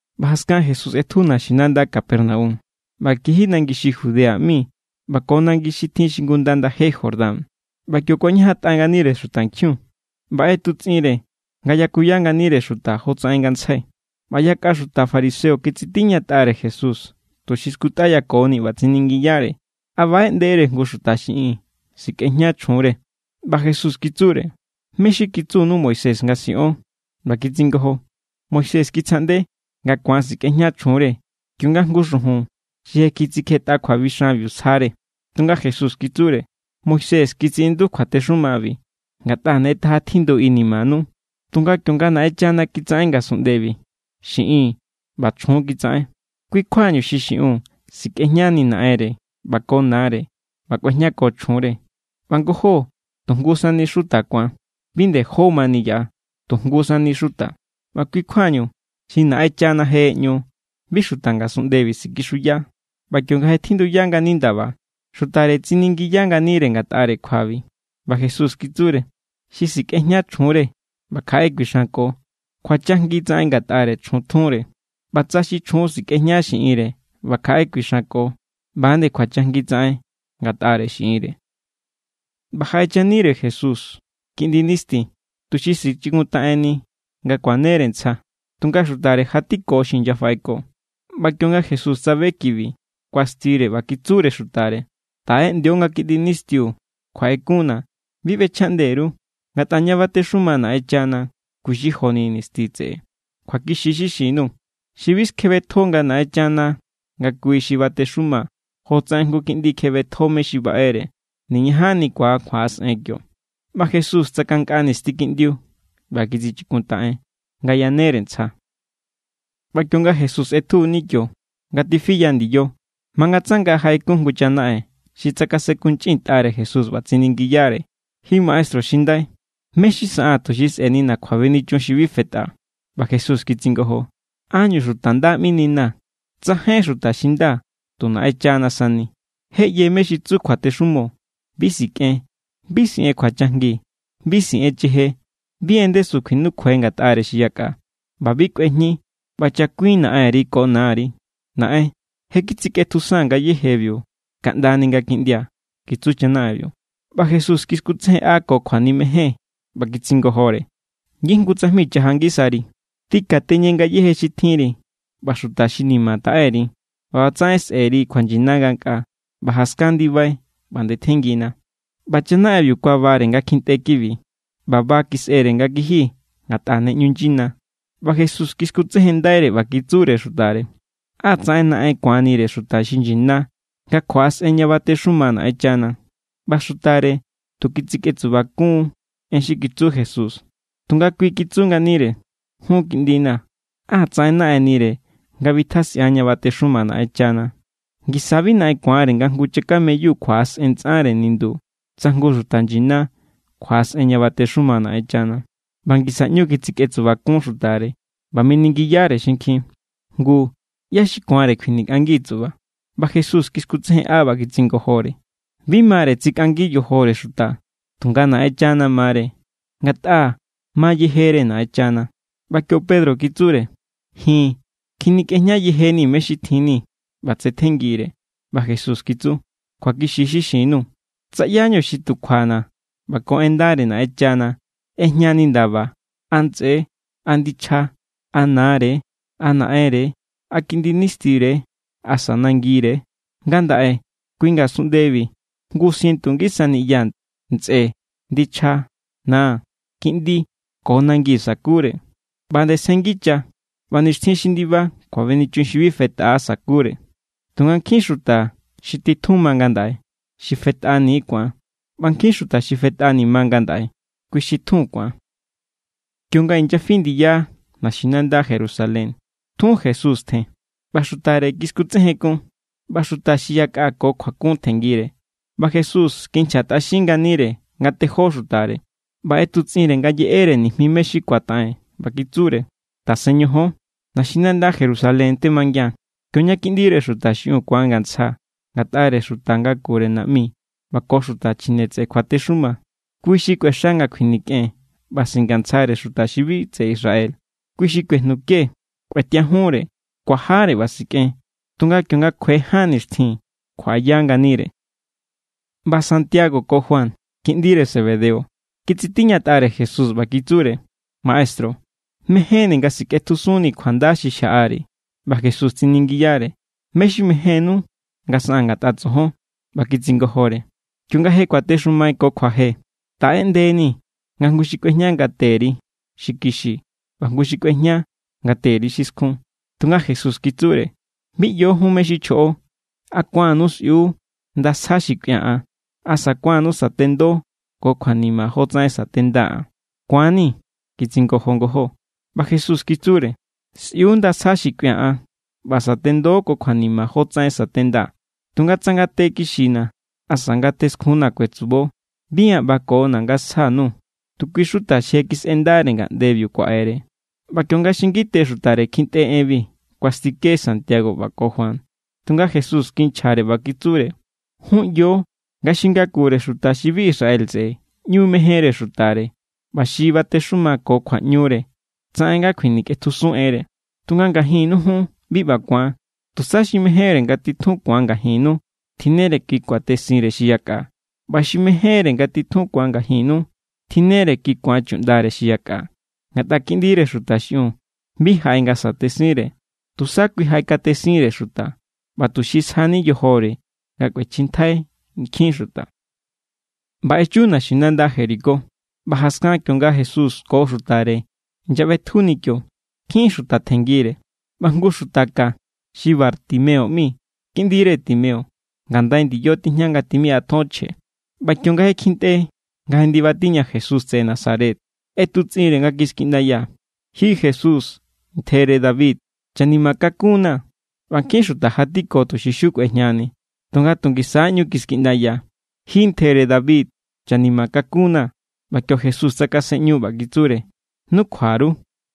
ꞌBa jaskan Jesús ꞌetju naxinanda Capernaum, ꞌba kiji nangi xi Judea ꞌmi ꞌba ko nangi xi tjin xingunda ndaje Jordán. ꞌBa kio kuañajantꞌa nganire xutankjiun, ꞌba ꞌetutsꞌinre nga yakuya nganire xuta jotsaꞌen ngantsjai. ꞌBa yakꞌa xuta fariseo kitsitiñatꞌare Jesús tuxi skutꞌayakoni, ꞌba tsiningiyare: —¿A baꞌeꞌndere jngu xuta xiꞌin sikꞌejña chjunre? ꞌBa Jesús kitsure: —¿Mé= xi kitsunu Moisés nga siꞌon? ꞌBa kitsingojo: —Moisés kitsjaꞌnde nga ku̱an sikꞌejña chjunre kionga jngu xujun xi je kitsikjetꞌa kjuabixanbiu sjare. Tunga Jesús kitsure: —Moisés kitsiꞌindu kjuatexumabi ngatꞌa ne taja tjindu inimanu. Tunga kionga Naꞌenchana kitsaꞌen ngasunꞌndebi, “xiꞌin ꞌba chjun kitsaꞌen”. “Kui kjuañu xi xiꞌun sikꞌejñani naꞌenre ꞌba ko nare ꞌba kꞌuejñako chjunre, ꞌba ngojó tu jngu sani xuta ku̱an.” Bi nde jó mani yaꞌa, tu jngu sani xuta. ꞌBa kui kjuañu xi Naꞌenchana je ꞌeꞌñu, bi xuta ngasunꞌndebi sikixuya. ꞌBa kionga je tjinduya ngani ndaba, xutare tsiningiya nganire ngatꞌare kjuabi. ꞌBa Jesús kitsure: —Xi sikꞌejña chjunre ꞌba kjaꞌe kuixanko, kjuachajngi tsaꞌen ngatꞌare chjun tjunre; ꞌba tsa xi chjun sikꞌejña xiꞌinre ꞌba kjaꞌe kuixanko, ꞌba=nde kjuachajngi tsaꞌen ngatꞌare xiꞌinre. ꞌBa jaꞌechanire Jesús kiꞌndi nisti, tuxi sichikuntaꞌenni nga kuanere ntsja; tunga xutare jatiko xi inyafaꞌeko. ꞌBa kionga Jesús tsabe kibi, kuastire ꞌba kitsure xutare: —Taꞌeꞌndio nga nisti kiꞌndiu kjuaꞌekunna̱, bi ꞌbechjaꞌnde_ru, ngatꞌa ña batexuma Naꞌenchana kui xi joni nisti tseꞌe. Kjuakixi= xi xin_nuu̱, xi bi skjebetjo nga Naꞌenchana nga kui= xi batexuma jotsaꞌen jngu kiꞌndi kjebetjo mé= xi baꞌere, niñajanni ku̱an kjuaꞌasꞌen kio. ꞌBa Jesús tsakankꞌa nisti kiꞌndiu ꞌba kitsichikuntaꞌen, nga yanere ntsja. ꞌBa kionga Jesús ꞌetjuni kio, nga tifiya ndiyo, mangatsanga jaꞌe jngu chanaꞌen xi tsakasenkunchꞌintꞌare Jesús ꞌba tsiningiyare: —Ji maestru xi ndai, ¿mé= xi saꞌaa̱n tuxi sꞌe̱nina̱ kjuabenichun xi bi fetꞌa? ꞌBa Jesús kitsingojo: —¿Ánñu xuta nda ꞌmininaa̱? Tsajainjín xuta xi nda, tu Naꞌenchana sani. Je ꞌye mé= xi tsu kjuatexumo: “Bi sikꞌen; bi siꞌen kjuachajngi; bi siꞌen cheje; bi en ndesu kjuinukjuai ngatꞌare xi yakꞌa; ꞌba bi kꞌuejñi; ꞌba chakuin naꞌenri ko nari.” —Naꞌen, je kitsikꞌetjusaa̱n ngayéjebiu kaꞌndani nga kiꞌndia̱ —kitsu chanaꞌenbiu. ꞌBa Jesús kiskutsejenꞌa ko kjuanimejen, ꞌba kitsingojore: —Ngijngu tsajmi chaja ngisari: tꞌikateñe ngayéje xi tjinri ꞌba xuta xi ni̱ma̱ taꞌe_ri, ꞌba ꞌbatsaꞌen sꞌe̱ri kjuanyina ngankꞌaa; ꞌba jaskan ndibai, ꞌba ndetjenngina. ꞌBa chanaꞌenbiu kuabare nga kjintꞌe kibi, ꞌba ba kisꞌere nga kiji, ngatꞌa ne ꞌñu nyina. ꞌBa Jesús kiskutsejenndaire, ꞌba kitsure xutare: —¡Á tsaꞌen naꞌen ku̱anire xuta xi nyina nga kjuaꞌasꞌen ña batexuma Naꞌenchana! ꞌBa xutare tu kitsikꞌetsubakun= en xi kitsu Jesús; tunga kui kitsu nganire: —Jun kiꞌndina̱, ¡á tsaꞌen naꞌennire nga bitjasꞌian ña batexuma Naꞌenchana! Ngisa= bi naꞌen ku̱anre nga jngu chakameyu kjuaꞌasꞌen ntsꞌare nindu, tsa jngu xuta nyina kjuaꞌasꞌen ña batexuma Naꞌenchana. ꞌBa ngisa ꞌñu kitsikꞌetsubakun xutare, ꞌba miningiyare xinkjin: —Ngu ¿ꞌyá xi ku̱anre kjuinikꞌangi tsuꞌba? ꞌBa Jesús kiskutsejenꞌa, ꞌba kitsingojore: —Bi mare tsikꞌangi yojore xuta, tunga Naꞌenchana mare; ngatꞌa ma yejere Naꞌenchana. ꞌBa kio Pedro kitsure: —Ji̱n kjinikꞌejña yejeníi̱ mé= xi tjinni̱, ꞌba tsetjenngiri̱. ꞌBa Jesús kitsu: —Kjuakixi= xi xin_nuu̱, tsa ꞌyáñu xi tu kjuana̱ ꞌba ko en ndare Naꞌenchana ꞌejñani ndaba, a ntsꞌe, a ndichja, a nare, a naꞌenre, a kiꞌndi nistire, asa nangire, ngandaꞌe kui ngasunꞌndebi jngu sientu ngisa niꞌya, ntsꞌe, ndichja, na, kiꞌndi ko nangi sakure. ꞌBa nde sjenngicha. ꞌBa nixtjin xi ndiba kjuabenichun xi bi fetꞌa sakure. Tunga nkjin xuta xi titjun ma ngandaꞌe, xi fetꞌani= ku̱an; ꞌba nkjin xuta xi fetꞌani ma ngandaꞌe, kui xi titjun ku̱an. Kionga inyafi ndiya naxinanda Jerusalén, tjun Jesús tjen. ꞌBa xutare kiskutsejenkun, ꞌba xuta xi yakꞌa ko kjuakun tjenngire. ꞌBa Jesús kinchjatꞌaxin nganire nga tejó xutare, ꞌba ꞌetutsꞌinre nga yeꞌere nijmi mé= xi ku̱ataꞌen. ꞌBa kitsure: —Tasen ñojón, naxinanda Jerusalén temangian, kioña Kiꞌndire Xuta xiꞌiun ku̱angantsja ngatꞌare xuta ngakure naꞌmi ꞌba ko xuta chjine tseꞌe kjuatexuma, kui xi kꞌuexa nga kjuinikꞌen ꞌba singantsjare xuta xi bi tseꞌe Israel. Kui= xi kuejnuke, kꞌuetiajunre, kuajare ꞌba sikꞌen; tunga kionga kjue ján nixtjin, kjuaꞌaya nganire. ꞌBa Santiago ko Juan, kiꞌndire Zebedeo, kitsitiñatꞌare Jesús ꞌba kitsure: —Maestru, mejénni̱ nga sikꞌetjusunnii̱ kjuanda xi xjaꞌari̱. ꞌBa Jesús tsiningiyare: —¿Mé= xi mejénnú nga saꞌaa̱n ngatꞌa tsojon? ꞌBa kitsingojore: —Kionga je kuatexumai ko kjuaje, taꞌeꞌndenii̱ nga jngu xi kꞌuejña ngate_ri xi kixi ꞌba jngu xi kꞌuejña ngate_ri xi skjun. Tunga Jesús kitsure: —Bi ꞌyo jun mé= xi chjoꞌo. ¿A ku̱annu sꞌiu nda sja xi kꞌuia̱ an? ¿Asa ku̱annu satendo ko kjuanima jotsaꞌen sa̱tendaa̱ an? —Ku̱an=ni̱ —kitsingojo ngojó. ꞌBa Jesús kitsure: —Sꞌiu nda sja xi kꞌuia̱ an, ꞌba sa̱tendo ko kjuanima jotsaꞌen sa̱tendaa̱; tunga tsa ngate kixina̱ asa ngate skjunna̱ kuetsubo, bi an ꞌbakona̱ nga sja_nuu̱, tu kui= xuta xi je kisꞌendare ngaꞌndebiu kuaꞌere. ꞌBa kionga xi ngite xutare kjintꞌe enbi, kuastike Santiago ꞌba ko Juan. Tunga Jesús kinchjare, ꞌba kitsure: —Jun ꞌyo nga xi ngakure xuta xi bi tseꞌe Israel ꞌñu mejenre xutare, ꞌba xi batexuma ko kjuaꞌñure tsaꞌen nga kjuinikꞌetjusun enre. Tunga ngajinnu jun bi ꞌba ku̱an. Tusa, xi mejénre nga titjun ku̱an ngajinnu, tjinnere kui kuatesinre xi yakꞌa; ꞌba xi mejénre nga titjun ku̱an ngajinnu, tjinnere kui ku̱an chuꞌndare xi yakꞌa. Ngatꞌa Kiꞌndire Xuta xiꞌiun bi jaꞌe nga sa̱tesinre, tusa kui jaꞌekatesinre xuta, ꞌba tuxi sjani yojore nga kꞌuechjintjai nkjin xuta. ꞌBa echu naxinanda Jericó. ꞌBa jaskan kionga Jesús ko xutare inyaꞌbetjuni kio, nkjin xuta tjenngire. ꞌBa jngu xuta ka xi Bartimeo ꞌmi, kiꞌndire Timeo, ngandai ndiyo tijña nga tjimiꞌa ton chje. ꞌBa kionga kjintꞌe nga je ndiba tiña Jesús tseꞌe Nazaret, ꞌetutsꞌinre nga kiskiꞌndaya: —¡Ji Jesús, ntjere David, chanima kakunnaa̱! ꞌBa nkjin xuta jatiko tuxi kꞌuejñaxiuni, tunga tu ngisa= ꞌñu kiskiꞌndaya: —¡Ji, ntjere David, chanima kakunnaa̱! ꞌBa kio Jesús tsakasenꞌñu, ꞌba kitsure: —Nukjua_ru.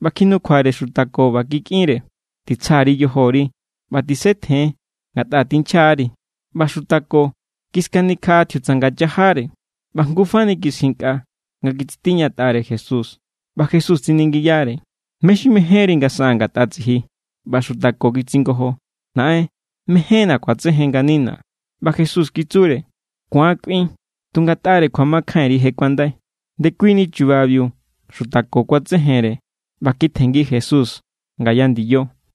ꞌBa kjinukjuare xuta ko ꞌba kikꞌinre: —Titsja_ri yojori, ꞌba tisetjen, ngatꞌa tinchja=ri. ꞌBa xuta ko kiskanikjaꞌa tjiutsanga chajare, ꞌba jngu fani kiskjinkꞌa nga kitsitiñatꞌare Jesús. ꞌBa Jesús tsiningiyare: —¿Mé= xi mejénri nga saꞌaa̱n ngatꞌa tsiji? ꞌBa xuta ko kitsingojo: —Naꞌen, mejénna̱ ku̱atsejen nganina̱. ꞌBa Jesús kitsure: —Ku̱an kꞌuin; tu ngatꞌare kjuamakjainri, je kuandai. Ndekuini chubabiu xuta ko kuatsejenre, ꞌba kitjenngi Jesús ngaya ndiyo.